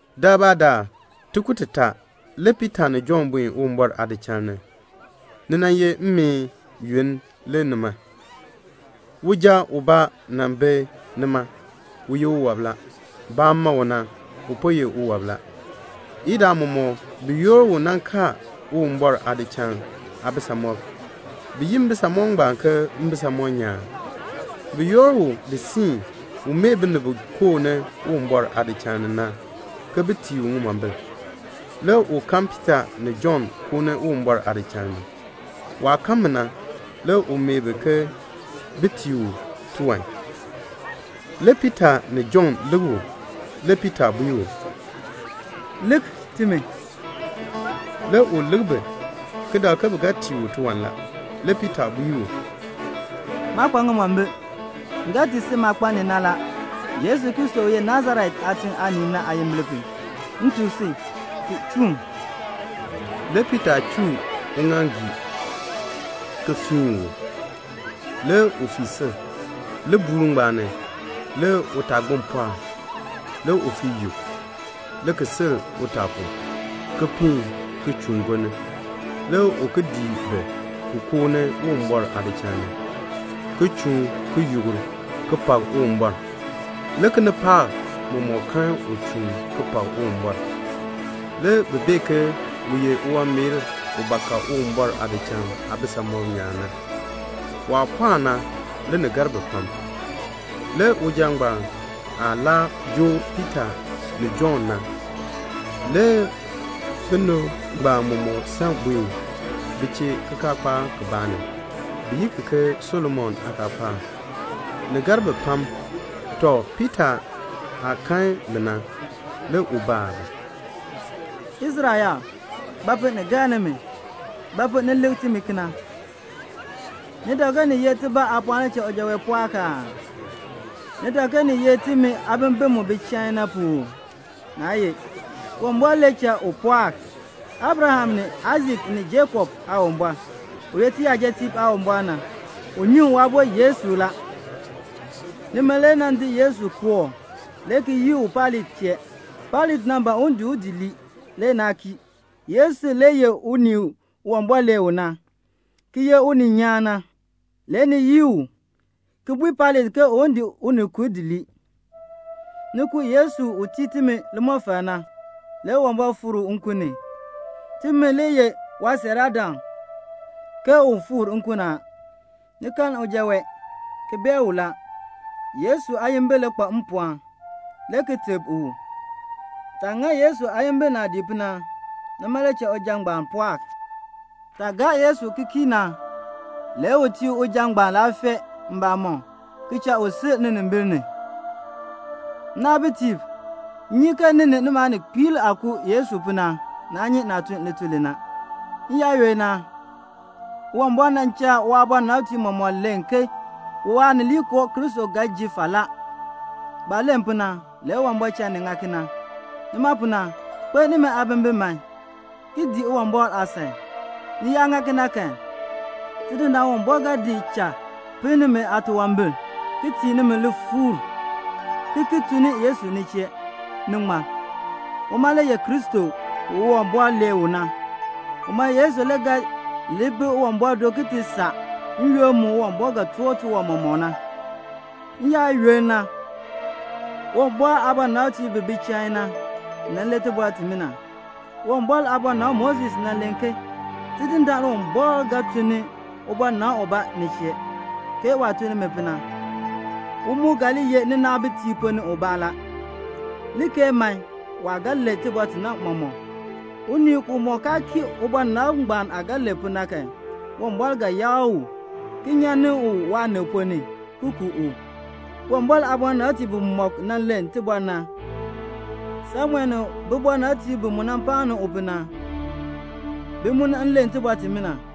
Daalbaadaal tikur titaa, le Piita ni Jɔnn buen Uwumbɔr aadichal ni. Ni nan ye mmeen yoonn le nima. Uja ubaa le nan bi nima. U ye uwɔb la. Baah nan ma u na, u po ye uwɔb la. Idaa mɔmɔk bi yoor u nan kaan Uwumbɔr aadichal aabisamɔb. Bi yi mbisamɔb ngbaan ke "Mbisamɔb nyaan." Bi yoor u di siin, un mee binib bi koo ni Uwumbɔr aadichal ni na, ke bin tii u ŋimombil. Le u kan Piita ni Jɔnn koo ni Uwumbɔr aadichal ni. Waah kan bi na, le u mee bi ke bin tii u tiwan. Le Piita ni Jɔnn lik u. Le Piita bui u, "Lik timi." Le u lik bi, ki dak ke bi ga tii u tiwan la. Le Piita bui u, "Maa kpa ŋimombil. M ga tii si maah kpa ni na la. Yesu Kristo u ye Nasaret aatiŋ aanii na aayimbil pu, m tuk si, fii chuun." Le Piita chuu uŋaaŋgii, ki fiin u. Le u fii sil. Libuul ngbaan ni, le utaagbin pɔɔk a. Le u fii yuk, le ki sil utaa pu, ki piin ki chuun gonni, le ki dii bi, ki koo ni Uwumbɔr aadichal ni, ki chuun, ki yukr, ki pak Uwumbɔr. Le kinipaak mɔmɔk kan u chuun ki pak Uwumbɔr. Le bi bee ke u ye uwanmeer u ba ka Uwumbɔr aadichal aabisamɔb nyaan na. Waah pɔɔk na, le ni gar bi pam. Le uja ngbaan aah laa joo Piita ni Jɔnn na, le binib ngbaan mɔmɔk san buen bi chee kikaakpaak kibaa ni, bi yi ki ke "Solomon aakaakpaak." Ni gar bi pam. Tɔ, Piita aah kan bi na, le u baa bi, "Israel yaab, ba pu ni gar nimi? Ba pu ni lik timi kena? Ni dak ke ni ye tibaa aapɔɔn le cha uja wee pɔɔk aa? Ni dak ke ni ye timi aabimbin mu bi chain na pu uu? Naa ye. Uwumbɔr le cha u pɔɔk. Abraham ni Aisak ni Jakob Aawumbɔr, u ye tiyajatiib Aawumbɔr na, u nyuŋ Waabo Yesu la. Nimi le nan di Yesu di kooh, le ki yii u Pailat chee. Pailat nan ban un di u di lii. Le naa kii. Yesu le ye unii u Uwumbɔr lee u na, ki ye uninyaan na. Le ni yii u, ki bui Pailat ke un di unikur di lii. Ni ku Yesu u tii timi limɔfal na. Le Uwumbɔr fikr u nkun ni. Timi le ye waasiiraadam ke u fikr nkun ni a. Ni kan uja wee, ki bee u la. Yesu aayimbil le kpa mpɔɔn, le ki teb u. Taah ŋa Yesu aayimbil naadii pu na, nima le cha uja ngbaan pɔɔk. Taah gaa Yesu ki kii na, le u tii uja ngbaan laafee mbamɔm, ki cha u sil ninimbil ni. "Nnaabitiib, m nyi ke ni ni nimi aaninkpiib aah ku Yesu pu na, naa nyi naah tun lituln li na. N-yaayoonn na, Uwumbɔr nan cha waabɔnabtiib mɔmɔk len ke Waanileekoo Kristo ga nan ji falaa. Baah len pu na, le Uwumbɔr cha ni ŋa kena. Nima pu na, kpeln nimi aabimbin man, ki dii Uwumbɔr aasan. Ni yaa ŋa kena kan, Tidindaan Uwumbɔr ga di cha pinn nimi aatunwambir, ki tii nimi lifuur, ki ki tun ni Yesu ni chee, ni ŋmar. Uma le ye Kristo, u Uwumbɔr lee u na. Uma Yesu le ga li bi Uwumbɔr do ki ti saa n-yoonn mu Uwumbɔr ga toor tiwan mɔmɔk na. N-yaayoonn na, Uwumbɔr aabɔnabtiib bi bi chain na, nan len tibɔr timina. Uwumbɔr aabɔnabr Moses nan len ke, 'Tidindaan Uwumbɔr ga tun ni ubɔnabr ubaa ni chee, ke waah tun ni mi pu na. U mu ga li ye ninaabitiib ponn ni ubaa la. Li keei man, waah ga len tibɔr ti na mɔmɔk. Unii umɔk kaa kii ubɔnabr ngbaan aah ga len pu na kan, Uwumbɔr ga yakr u, ki nyan ni u waanib ponn ni, ki ku u.' Uwumbɔr aabɔnabtiib bimɔk nan len tibɔr na, Samuel ni bibɔnabtiib bi mu paan u pu na, bi mu nan len tibɔr timina.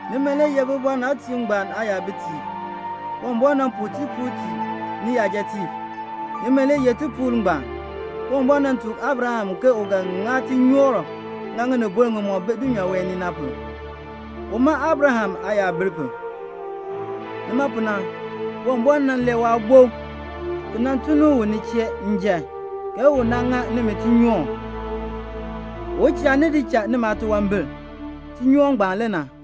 Nimi le ye bibɔnabtiib ngbaan aayabitiib. Uwumbɔr nan puu tipuul tii niyajatiib. Nimi le yeh tipuul ngbaan. Uwumbɔr nan tuk Abraham ke u ga ŋa tinyoor ŋinibol ŋimɔk bi dulnyaa wee ni na pu, uma Abraham aayabil pu. Nima pu na Uwumbɔr nan lee Waabo, ki nan tun ni u ni chee njan, ke u nan ŋa nimi tinyoor; u cha ni di cha nimi aatunwambir; tinyoor ngbaan le na."